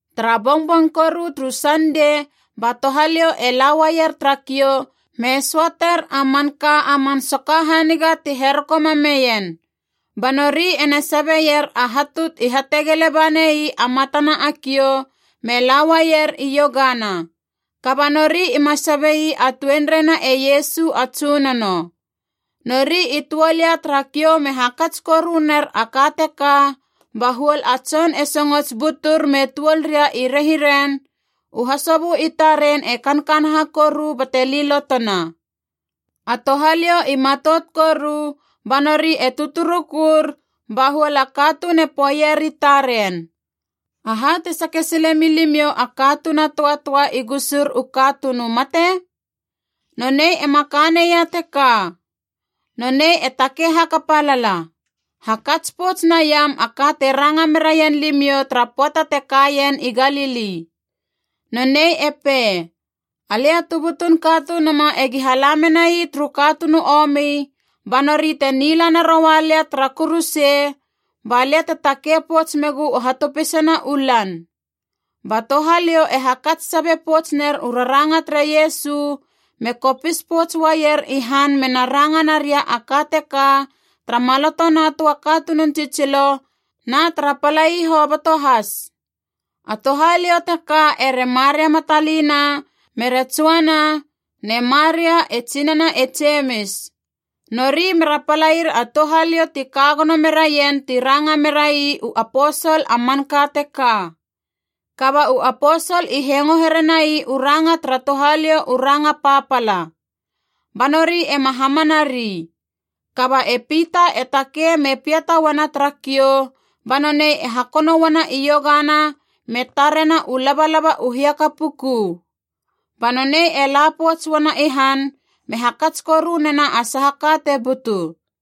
Tara bongbong koru turu Sandei ba touhaliou e la uaier tara kiou me söater a manka a man soka haniga ti heroko mameien. Ba nori ena sabeier a hatu i hategele bane ii a matana a kiou, me la uaier iogana. Kaba nori ima sabe ii a tuenreina e Iesu a Tsunono. Nori i tuol ia tara kiou me hakats koru ner a ka teka, ba huol a tson e songots butur me tuol ria i rehiren, u hasobö i taren e kankanaha koru bate lilotona. A touhaliou i matout koru, ba nori e tuturukur, ba huol a katuun e poeier i taren, “Aha te sake sile milimiou a katuun a töatöa i gusur u katuun u mate? Nonei ema ka neia teka. Nonei e takei hakapa lala. Hakats pouts naiam a ka te ranga meraien limiou tara pöata te kaien i Galili. Nonei e pei, ‘Alia tu butun Katunuma egi hala menai turu katuun u omi, ba nori te nila naroua lia tara kuruse, ba lia te takei pouts megu u hatopisana u lan.’” Ba touhaliou e hakats sabe pouts ner u raranga tere Iesu, me kopis pouts uaier i han mena ranga naria a ka teka tara maloto na töa katunun tsitsilo na tara palai hoboto has. A touhaliou teka ere Maria Matalina mere Joana ne Maria, e tsinana e Jemis. Nori mera palair a touhaliou ti ka gono meraien ti ranga merai u aposol a manka teka. Kaba u aposol i hengo herenai u ranga tara touhaliou u ranga papala. Ba nori ema hamana ri. Kaba e Pita e takei me piata uana tara kiou, ba nonei e hakono uana iogana me tarena u labalaba u hiaka puku. Ba nonei e la pouts uana i han me hakats koru nena a saha ka te butu.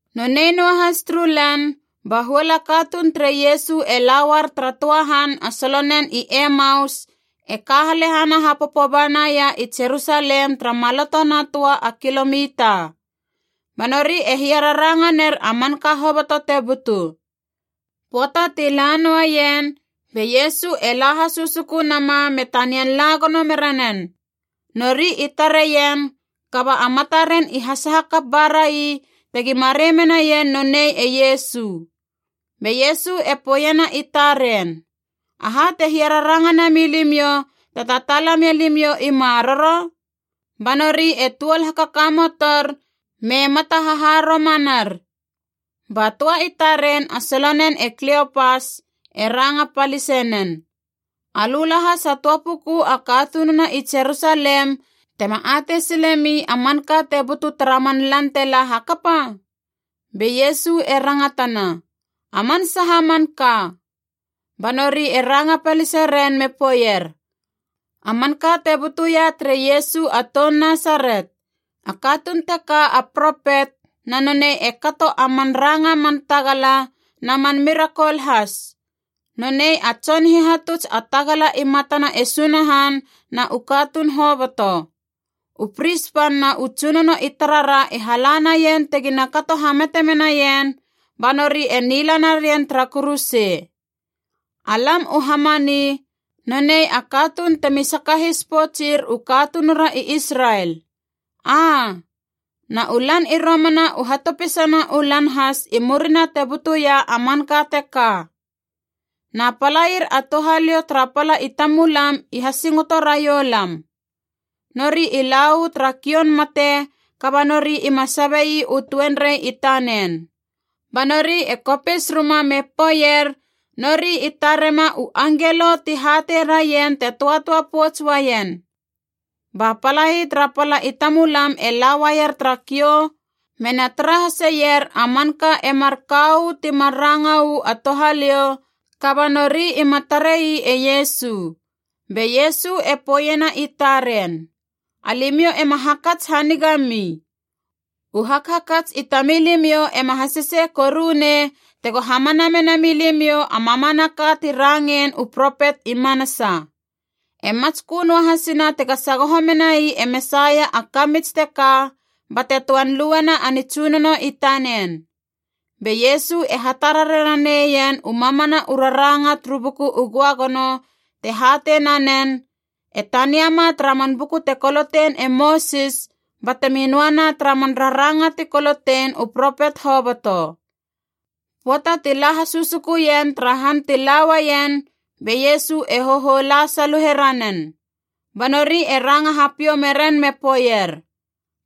Nonei noa has turu lan ba huol a katuun tere Iesu e la uar tara töa han a solonen i Emaus, e ka halehana hapopo banaia i Jerusalem tara maloto na töa a kilomita. Ba nori e hiararanga ner a manka hoboto te butu. Pöata ti la noaien, be Iesu e la hasusuku nama me tanian la gono mera nen. Nori i tareien, kaba a mataren i hasaha kap ba rai tegi marei menaien nonei e Iesu. Be Iesu e poeiena i taren, “Aha te hiararanga nami limiou te tataala mia limiou i maroro?” Ba nori e tuol hakakamotor me mata haharomanar. Ba töa i taren a solonen e Kliopas e ranga palise nen, “Alö lahas a töa puku a katununa i Jerusalem tema atei silemi a manka te butu tara man lan te la hakapa?” Be Iesu e rangatana, “A man saha manka?” Ba nori e ranga palise ren me poeier, “A manka te butuia tere Iesu a toun Nasaret. A katuun teka a propet, na nonei e kato a man ranga man tagala na man mirakol has. Nonei a tson hihatuts a tagala i matana e Sunahan na u katuun hoboto. U pris pan na u tsunono i tarara i hala naien tegina kato hamate menaien, ba nori e nila narien tara kuruse. Alam u hamani: ‘Nonei a katuun temi sakahis poutsir u katunura i Israel.’ Aa, na u lan i romana u hatopisana u lan has i murina te butuia a manka teka. Na palair a touhaliou tara pala i tamulam i hasingoto raiou lam. Nori i la uu tara kioun mate, kaba nori ima sabe ii u tuenrei i tanen. Ba nori e kopis ruma me poeier nori i tarema u angelo ti hatei raien te töatöa pouts uaien. Ba palai tara pala i tamulam e la uaier tara kiou mena tara haseier a manka e marka uu timar ranga uu a touhaliou, kaba nori ima tarei e Iesu.” Be Iesu e poeiena i taren, “Alimiou ema hakats hanigami. U hakhakats i tamilimiou ema hasese korunei tego hamana mena milimiou a mamanaka ti rangein u propet i manasa! E matskö noa hasina tega sagoho menai e Mesaia a kamits teka bate töan luena a nitsunono i tanen.” Be Iesu e hatarare raneien u mamana u raranga turu Buku u Göagono te hatei nanen, e taniama tara man buku te kolotein e Mosis batemi noana tara man raranga ti kolotein u propet hoboto. Pöata ti la hasusukuien tara han ti la uaien, be Iesu e hohou la saluhe ranen. Ba nori e ranga hapiou meren me poeier,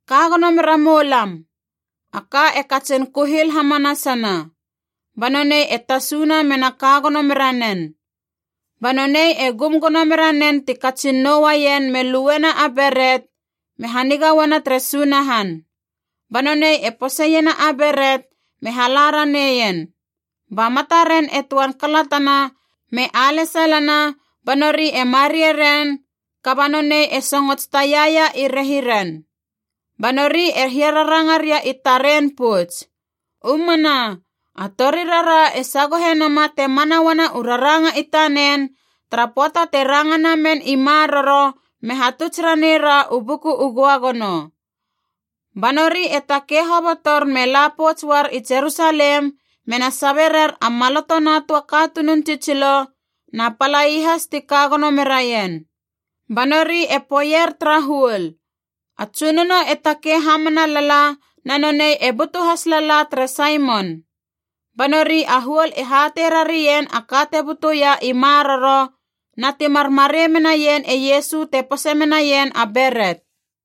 “Ka gono mera moulam. A ka e katsin kuhil hamanasa.” Ba nonei e tasuna mena ka gono mera nen. Ba nonei e gum gono mera nen ti katsin nou uaien me luena a beret, me haniga uana tere Sunahan. Ba nonei e poseiena a beret me hala raneien. Ba mataren e töan kalatana me alesalana ba nori e mareie ren, kaba nonei e songots taiaia i rehiren. Ba nori e hiararanga ria i taren pouts, “U mana, a torirara e sagohe nama te mana uana u raranga i tanen, tara pöata te ranga namen i maroro me hatuts ranei ra u Buku u Göagono.” Ba nori e takei hobotor me la pouts uar i Jerusalem mena sabe rer a maloto na töa katunun tsitsilo na palai has ti ka gono meraien. Ba nori e poeier tara huol, “A Tsunono e takei hamana lala na nonei e butu has lala tere Saimon!” Ba nori a huol e hatei rarien a ka te butuia i maroro, na timar marei menaien e Iesu te pose menaien a beret.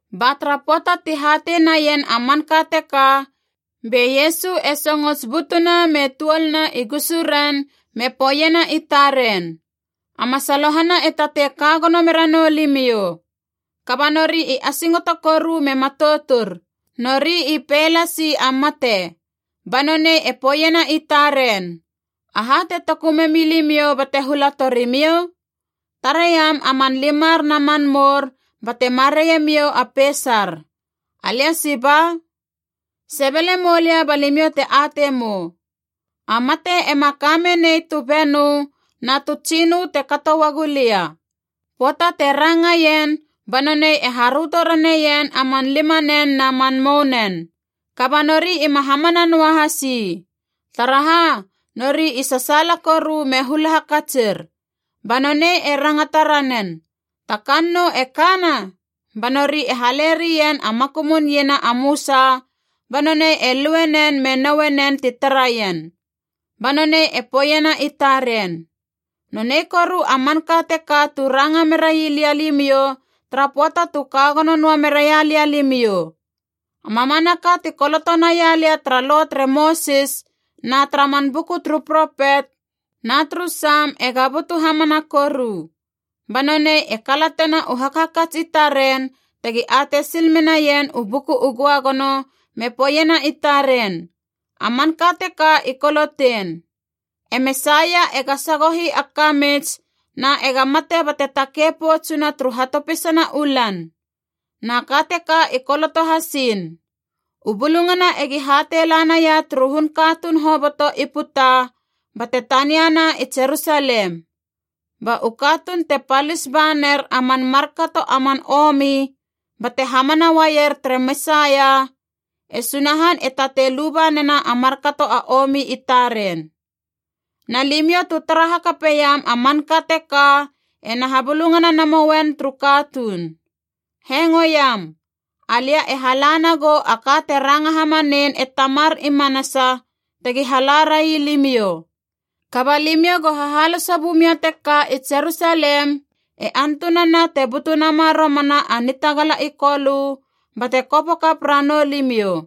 Ba tara pöata ti hatei naien a manka teka, be Iesu e songots butuna me tuolna i gusuren me poeiena i taren, “A masalohana e tatei ka gono mera nou limiou.” Kaba nori i asingoto koru me matoutur. Nori i pei lasi a mate. Ba nonei e poeiena i taren, “Aha te toku memi limiou bate hula tori miou? Tareiam a man limar na man mour bate mareie miou a peisar. Alia siba! Sebele moulia ba limiou te atei mou. A mate ema ka menei tu benö na tu tsinö te kato uagu lia.” Pöata te rangaien ba nonei e haröto raneien a man limanen na man mounen. Kaba nori ima hamana noahas ii. Taraha? Nori i sasaala koru me hula hakatsir. Ba nonei e rangata ranen, “Ta kannou e kana?” Ba nori e hale rien a makumun iena a mösa, ba nonei e lue nen me noue nen ti taraien. Ba nonei e poeiena i taren, “Nonei koru a manka teka tu ranga merai lia limiou tara pöata tu ka gono noa meraia lia limiou: a mamanaka ti koloto naia lia tara Lo tere Mosis na tara man buku turu propet na turu Sam ega butu hamana koru.” Ba nonei e kalatena u hakhakats i taren tegi atei sil menaien u Buku u Göagono, me poeiena i taren, “A manka teka i kolotein: e Mesaia ega sagohi a kamits na ega mate bate takei poutsuna turu hatopisana u lan. Na ka teka i koloto hasiin: u bulungana egi hatei la naia turu hun katuun hoboto i puta bate taniana i Jerusalem. Ba u katuun te palis ba ner a man markato a man omi bate hamana uaier tere Mesaia, e Sunahan e tatei luba nena a markato a omi i taren. Na limiou tu tara hakapeiam a manka teka ena habulungana namouen turu katuun. Hengoiam. Alia e hala nagou a ka te ranga hamanein e Tamar i manasa tegi hala rai limiou. Kaba limiou go hahaloso bumia teka i Jerusalem e antunana te butu nama romana a nitagala i Kolö bate kopo kap ranou limiou.”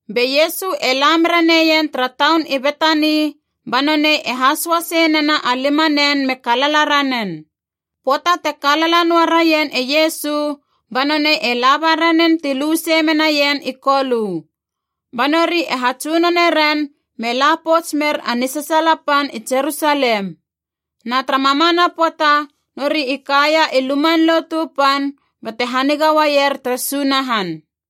Be Iesu e la mera neien tara taun i Betani, ba nonei e hasoa sei nena a limanen me kalala ranen. Pöata te kalala noa raien e Iesu, ba nonei e laba ranen ti lu sei menaien i Kolö. Ba nori e hatsunone ren me la pouts mer a nisasaala pan i Jerusalem. Na tara mamana pöata nori i kaia i Luman Lotu Pan bate haniga uaier tere Sunahan.